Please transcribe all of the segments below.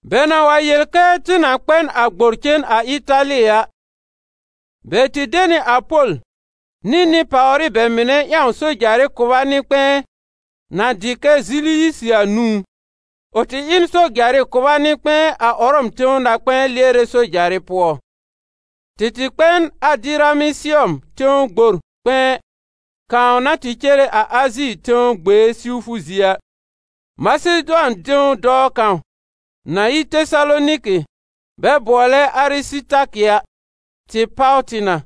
Bɛ na wa yel kɛ tɩ na kpɛ n a gbor cen a Ɩtali a, bɛ de nɩ a Pol nɩ nɩ-pàwrɩ bɛ mɩnɛ ƴãw sojarɩ kʋba nɩ-kpɛ̃ɛ na dɩ kɛ Ziliyisɩ a nũú. Ʋ tɩ ɩ n sojarɩ kʋba nɩ-kpɛ̃ɛ a Ʋrɔm tẽw na-kpɛ̃ɛ lɩɛrɛ sojarɩ pʋɔ. Tɩ tɩ kpɛ n Adɩramɩsɩɔm tẽw gbor kpɛ̃ɛ kãw na tɩ cere a Azi tẽw gbee siwfʋ zie a. Masedʋan tẽw dɔɔ kãw, na yi Tesaloniki bɛ bʋɔlɛ Arɩsɩtakɩ a, tɩ páw tɩ na.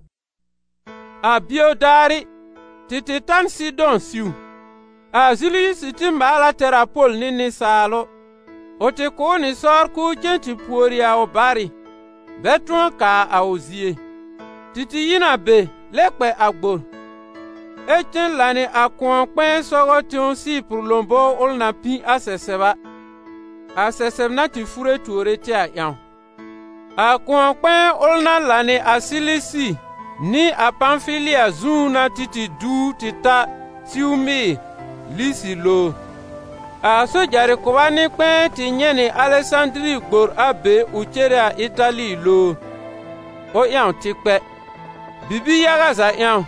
A bio daarɩ, tɩ tɩ ta n Sɩdɔ̃ siw. A Ziliyisɩ tɩ maal a tɛr a Pol nɩ nɩsaalʋ, ʋ tɩ kʋ̀ ʋ nɩ sɔr k'ʋʋ cen tɩ pùori a ʋ barɩ, bɛ tʋ̃ɔ kaa a ʋ zie. Tɩ tɩ yi n a be lɛ kpɛ a gbor, ɛ cen lãnɩ a kʋ̃ɔ-kpɛ̃ɛ sɔgɔ tẽw Sɩɩpʋr lõbowr ʋl na pĩ a sɛsɛb a, a sɛsɛb na tɩ fure tuore tɩ a ƴãw. A kʋ̃ɔ-kpɛ̃ɛ ʋl na lãnɩ a Silisi nɩ a Pãfili a zu n'a tɩ tɩ duw tɩ ta siw Mɩɩr Lisi lowr. A sojarɩ kʋba nɩ-kpɛ̃ɛ tɩ nyɛ̃ nɩ Alɛsãdiri gbor a be ʋ cere a Ɩtali lowr, ʋ ƴãw tɩ kpɛ. Bibi-yaga za ƴãw,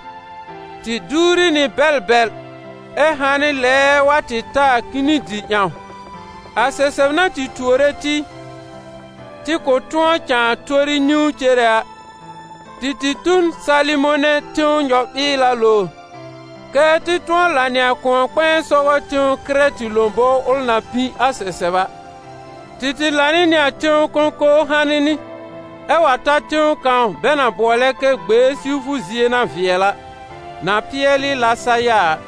tɩ duwri nɩ bɛl bɛl ɛ hanɩ lɛɛɛ wa tɩ ta a Kinidɩ ƴãw. A sɛsɛb na tɩ tuore tɩ, tɩ kʋ̃ tʋ̃ɔ cãa tori niwn cere a, tɩ tɩ tu n Salɩmonɛ tẽw nyɔ-mɩɩla lowr, kɛ́ tɩ tʋ̃ɔ lãnɩ a kʋ̃ɔ-kpɛ̃ɛ sɔgɔ tẽw Kɩrɛtɩ lõbowr ʋl na pĩ a sɛsɛb a. Tɩ tɩ lãnɩ nɩ a tẽw kõkowr hanɩ nɩ, ɛ wa ta tẽw kãw bɛ na bʋɔlɛ kɛ Gbee-siwfʋ-zie-na-vɩɛl-a, na pɩɛlɩ Lasaya a.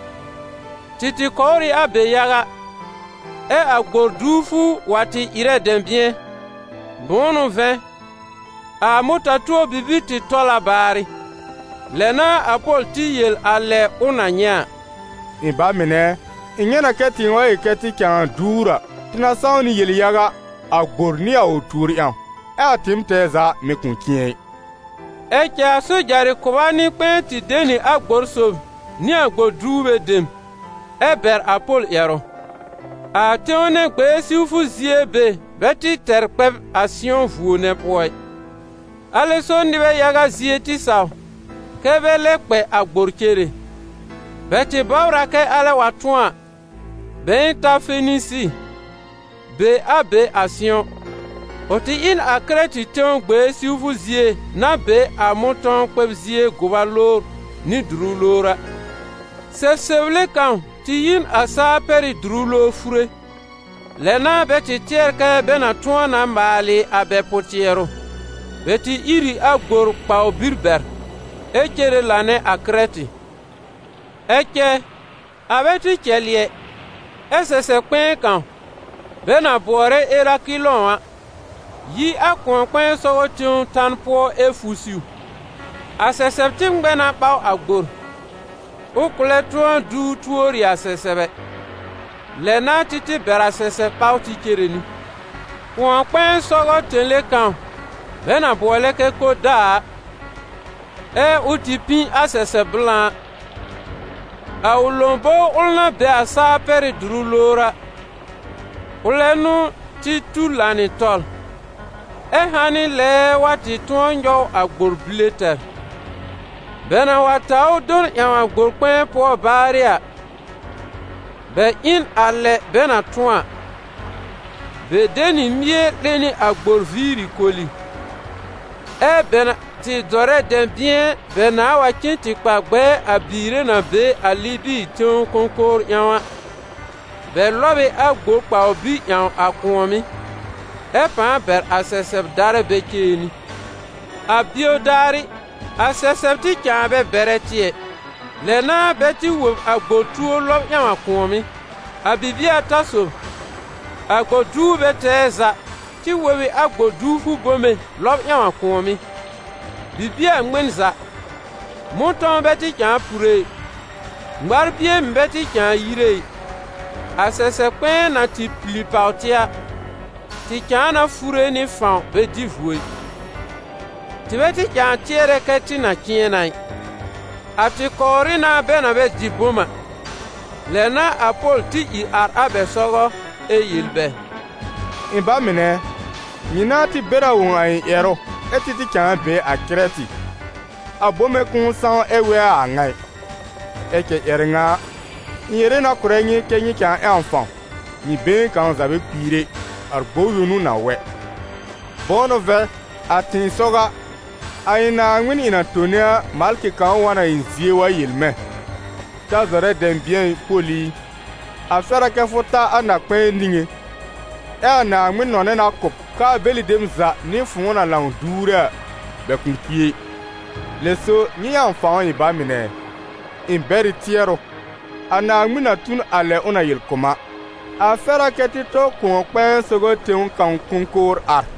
Tɩ tɩ kɔwr ɩ a be yaga, ɛ a gbor duwfʋ wa tɩ ɩrɛ dɛ̃bɩ̃ɛ, bʋ̃ʋ n'ʋ vɛ̃, a mʋta-tuo bibir tɩ tɔl a baarɩ. Lɛ n'a a Pol tɩ yel a lɛ ʋ na nyɛ̃ a: «Ɩ̃ ba mɩnɛ ɛ, ɩ̃ nyɛ̃ na kɛ tɩɩm wa yel kɛ tɩ cãa duwr a, tɩ na sãw nɩ yel-yaga, a gbor nɩ a ʋ tuor ƴãw, ɛ a tɩɩm tɛɛ za mì kʋ̃ cɩ̃ɛ ɩ.» Ɛ cɛ a sojarɩ kʋba nɩ-kpɛ̃ɛ tɩ de nɩ a gbor sob nɩ a gbor duwre dem, ɛ bɛr a Pol ƴɛrʋ. A tẽw nɛ gbee siwfʋ zie be bɛ tɩ tɛr kpɛb a sɩ̃ɔ vuo nɛ pʋɔ ɩ. Alɛ so nɩbɛ yaga zie tɩ saw kɛ́ bɛ lɛ kpɛ a gbor cere. Bɛ tɩ bɔbr a kɛ alɛ wa tʋ̃ɔ, bɛ̃ɛ ta Fenisi, be a be a sɩ̃ɔ. Ʋ tɩ ɩ n a Kɩrɛtɩ tẽw gbee siwfʋ zie na be a mʋ̃tɔ̃w-kpɛb-zie-gʋba lowr nɩ dʋrʋ lowr a. Sɛsɛble kãw tɩ yi n a saa-pɛrɩ́-dʋrʋ lowr fure. Lɛ n'a bɛ tɩ tɩɛr kɛ bɛ na tʋ̃ɔ na maalɩ a bɛ pʋ-tɩɛrʋ. Bɛ tɩ ír ɩ a gbor kpawbir bɛr, ɛ cere lanɛ a Kɩrɛtɩ. Ɛ cɛ, a bɛ tɩ cɛlɩ ɛ, ɛ́ sɛsɛb kpɛ̃ɛ kãw, bɛ na bʋɔlɛ Erakɩlɔ̃ a, yi a kʋ̃ɔ-kpɛ̃ɛ sɔgɔ tẽw tan pʋɔ ɛ fu siw. A sɛsɛb tɩ ŋmɛ na ɓaw a gbor, ʋ kʋ̃ lɛ tʋ̃ɔ duw tuori a sɛsɛb ɛ. Lɛ n'a tɩ tɩ bɛr a sɛsɛb ɓaw tɩ cere nɩ. Kʋ̃ɔ-kpɛ̃ɛ sɔgɔ tẽle kãw bɛ na bʋɔlɛ kɛ Koda a, ɛ ʋ tɩ pĩ a sɛsɛb blã a, a ʋ lobõwr ʋl na be a saa-pɛrɩ́-dʋrʋ lowr a, ʋlɛ n'ʋ tɩ tu lãnɩ tɔl, ɛ hanɩ lɛɛɛ wa tɩ tʋ̃ɔ nyɔw a gbor bile tɛr. Bɛ na wa taw ʋ do n ƴãw a gbor-kpɛ̃ɛ pʋɔ baarɩ a, bɛ ɩ n a lɛ bɛ na tʋ̃ɔ a: bɛ de nɩ mie 'lẽ nɩ a gbor viiri koli, ɛ́ bɛ na tɩ zɔrɛ dɛ̃bɩ̃ɛ bɛ nãa wa cen tɩ kpa gbɛɛ a biire na be a Libi tẽ-kõkowr ƴãw a, bɛ lɔb ɩ a gbor kpawbir ƴãw a kʋ̃ɔ̀mɩ́, ɛ pãa bɛr a sɛsɛb darɛ bɛ cere nɩ. A bio daarɩ, a sɛsɛb tɩ cãa bɛ bɛrɛ tɩ ɛ. Lɛ n'a bɛ tɩ wob a gbor tuor lɔb ƴãw a kʋ̃ɔ̀mɩ́. A bibie ata sob, a gbor duwrbɛ tɛɛ za tɩ wob ɩ a gbor duwfʋ bome lɔb ƴãw a kʋ̃ɔ̀mɩ́. Bibie a ŋmɩn za, mʋ̃tɔ̃w bɛ tɩ cãa pure ɩ, ŋmarbie mɩ̀ bɛ tɩ cãa yire ɩ, a sɛsɛb kpɛ̃ɛ na tɩ pili pàw tɩ a, tɩ cãa na fure nɩ fãw bɛ dɩ vuo ɩ. Tɩ bɛ tɩ cãa tɩɛrɛ kɛ tɩ na cɩ̃ɛ na ɩ. A tɩ kɔwrɩ na bɛ na bɛ dɩ bom a. Lɛ n'a a Pol tɩ ìr ar a bɛ sɔgɔ ɛ yel bɛ: «Ɩ̃ ba mɩnɛ ɛ, nyɩ nãa tɩ bɛr a wõ a ɩ̃ ƴɛrʋ ɛ tɩ tɩ cãa be a Kɩrɛtɩ, a bome kʋ̃ʋ sãw ɛ wɛ a a ŋa ɩ. Ɛ cɛ ƴɛrɛ ŋa a, ɩ̃ yere na kʋ̀rɛ nyɩ kɛ́ nyɩ cãa ƴãw fãw, nyɩ been kãw za bɛ kpiir ɛ, a gbor yõ n'ʋ na wɛ. Bʋ̃ʋ n'ʋ vɛ̃, a tɩ̃ɩsɔw a, a ɩ̃ Naaŋmɩn ɩ̃ na tone a, malkɩ kãw wa n a ɩ̃ zie wa yel mɛ̃: ‹Ta zɔrɛ dɛ̃bɩ̃ɛ ɩ, Pol i, a fɛr a kɛ́ fʋ ta a na-kpɛ̃ɛ niŋé, ɛ a Naaŋmɩn nɔnɛ na kʋ̀ b k'aa bɛlɩ dem za nɩ fʋ̃ʋ na lãw duwre a, bɛ kʋ̃ kpi ɛ!› Lɛ so, nyɩ ƴãw fãw, ɩ̃ ba mɩnɛ ɛ! Ɩ̃ bɛr ɩ tɩɛrʋ, a Naaŋmɩn na tu n a lɛ ʋ na yel kʋ̀ m a. A fɛr a kɛ́ tɩ tɔ kʋ̃ɔ-kpɛ̃ɛ sɔgɔ tẽw kãw kõkowr ar.»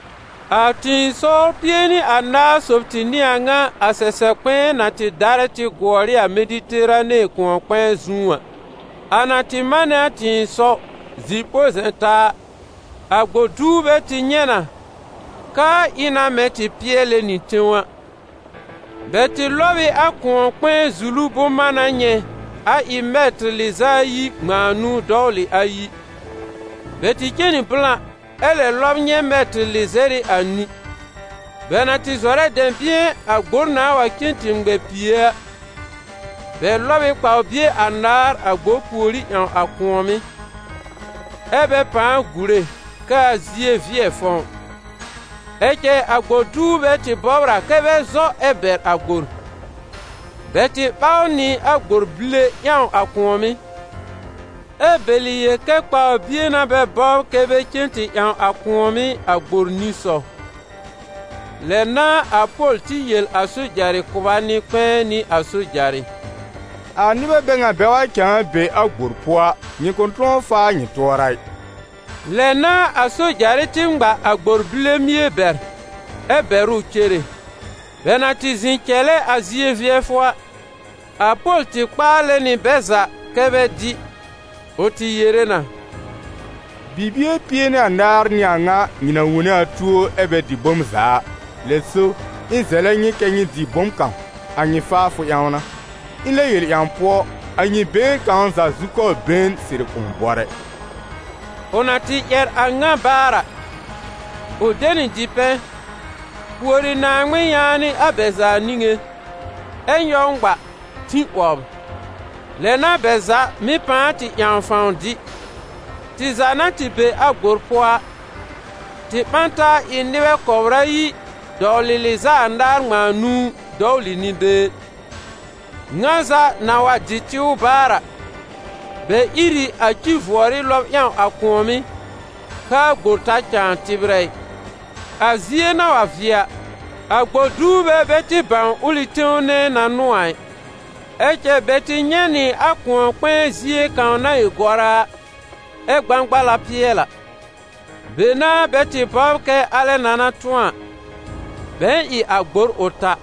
A tɩ̃ɩsɔwr pie nɩ anaar sob tɩ n'ɩ a ŋa a sɛsɛb na tɩ darɛ tɩ gʋɔr ɩ a Mediterane kʋ̃ɔ-kpɛ̃ɛ zu a. A na tɩ manɛ a tɩ̃ɩsɔw zi-põ-zɛ̃-taa a, a gbor duwrbɛ tɩ nyɛ̃ na k'aa ɩ na mɛ̃ tɩ pɩɛlɛ nɩ tẽw a. Bɛ tɩ lɔb ɩ a kʋ̃ɔ-kpɛ̃ɛ zulu bʋ̃-mána nyɛ̃ a ɩ mɛtɩr lɩz'a ayi ŋmãa nũu dɔwlɩ ayi. Bɛ tɩ cen nɩ blã ɛ lɛ lɔb nyɛ̃ mɛtɩr lɩzɛr ɩ anĩ. Bɛ na tɩ zɔrɛ dɛ̃bɩ̃ɛ a gbor nãa wa cen tɩ ŋmɛ pìe a, bɛ lɔb ɩ kpawbie anaar a gbor pùorí ƴãw a kʋ̃ɔ̀mɩ́, ɛ́ bɛ pãa gùre kɛ a zie vɩɛ fɔ̃w. Ɛ cɛ a gbor duwrbɛ tɩ bɔbr a kɛ bɛ zɔ ɛ bɛr a gbor; bɛ tɩ ɓaw nɩ a gbor bile ƴãw a kʋ̃ɔ̀mɩ́, ɛ bɛlɩ yel kɛ kpawbie n'a bɛ bɔbr kɛ́ bɛ cen tɩ ƴãw a kʋ̃ɔ̀mɩ́ a gbor nisɔw. Lɛ n'a a Pol tɩ yel a sojarɩ kʋba nɩ-kpɛ̃ɛ nɩ a sojarɩ: «A nɩbɛ bɛ ŋa bɛ wa cãa be a gbor pʋɔ a, nyɩ kʋ̃ tʋ̃ɔ faa nyɩ tʋɔra ɩ.» Lɛ n'a a sojarɩ tɩ ŋma a gbor bile mie bɛr, ɛ bɛr ʋ cere. Bɛ na tɩ zɩ̃ cɛlɛ a zie vɩɛfʋ a, a Pol tɩ kpaalɛ nɩ bɛ za kɛ́ bɛ dɩ. Ʋ tɩ yere na: «Bibie pie nɩ anaar n'ɩ a ŋa nyɩ na wone a tuo ɛ bɛ dɩ bom za a. Lɛ so, ɩ̃ zɛlɛ nyɩ kɛ nyɩ dɩ bom kãw, a nyɩ faafʋ ƴãw n'a. Ɩ̃ lɛb yel ƴãw pʋɔ, a nyɩ been kãw za zukɔbr been sɩrɩ kʋ̃ bɔr ɛ.» Ʋ na tɩ ƴɛr a ŋa baar a, ʋ de nɩ dipɛ̃, pùori Naaŋmɩn yaanɩ a bɛ za niŋé, ɛ nyɔw ŋma, tĩ 'wɔbr. Lɛ n'a bɛ za mɩ̀ pãa tɩ ƴãw fãw dɩ. Tɩ za na tɩ be a gbor pʋɔ a, tɩ ɓã n taa ɩ nɩbɛ kɔbr ayi dɔwlɩ lɩz'a anaar ŋmãa nũu dɔwlɩ nɩ-been. Ŋa za na wa dɩ tɩw baar a, bɛ ír ɩ a ci-vʋɔrɩ lɔb ƴãw a kʋ̃ɔ̀mɩ́ kɛ́ a gbor ta cãa tɩbrɛ ɩ. A zie na wa vɩɛ a, a gbor duwrbɛ bɛ tɩ bãw ʋlɩ tẽw nɛ na n'ʋ a ɩ. Ɛ cɛ bɛ tɩ nyɛ̃ nɩ a kʋ̃ɔ-kpɛ̃ɛ zie kãw na ɩ goraa a, ɛ gbãgbala pɩɛlɩ a. Be n'a bɛ tɩ bɔbr kɛ alɛ na na tʋ̃ɔ a, bɛ̃ɛ ɩ a gbor ʋ ta.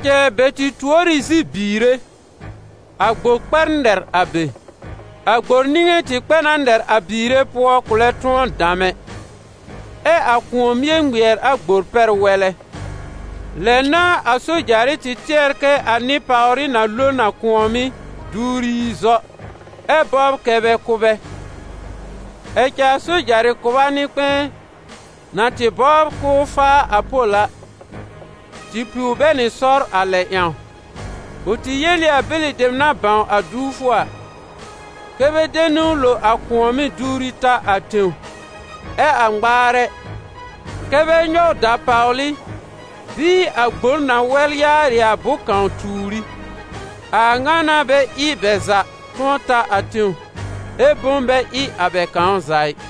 Ɛ cɛ bɛ tɩ tuor ɩ zi-biire, a gbor kpɛ nɛr a be. A gbor niŋé tɩ kpɛ na nɛr a biire pʋɔ kʋ̃ lɛ tʋ̃ɔ dam ɛ, ɛ a kʋ̃ɔ mie ŋmɩɛr a gbor pɛr wɛlɛ. Lɛ n'a a sojarɩ tɩ tɩɛr kɛ a nɩ-pàwrɩ na lo n a kʋ̃ɔ̀mɩ́ duwri yi zɔ, ɛ bɔbr kɛ́ bɛ kʋ́ bɛ. Ɛ cɛ a sojarɩ kʋba nɩ-kpɛ̃ɛ, na tɩ bɔbr k'ʋʋ faa a Pol a, tɩ piw bɛ nɩ sɔr a lɛ ƴãw. Ʋ tɩ yel ɩ a bɛlɩ dem na bãw a duwfʋ a, kɛ́ bɛ de niwn lo a kʋ̃ɔ̀mɩ́ duwri ta a tẽw; ɛ a ŋmaarɛ, kɛ́ bɛ nyɔw dapawlɩ bɩɩ a gbor na wɛl yaarɩ a bʋ̃-kãw tuur ɩ. A ŋa n'a bɛ ɩ bɛ za tʋ̃ɔ ta a tẽw, ɛ bom bɛ ɩ a bɛ kãw za ɩ.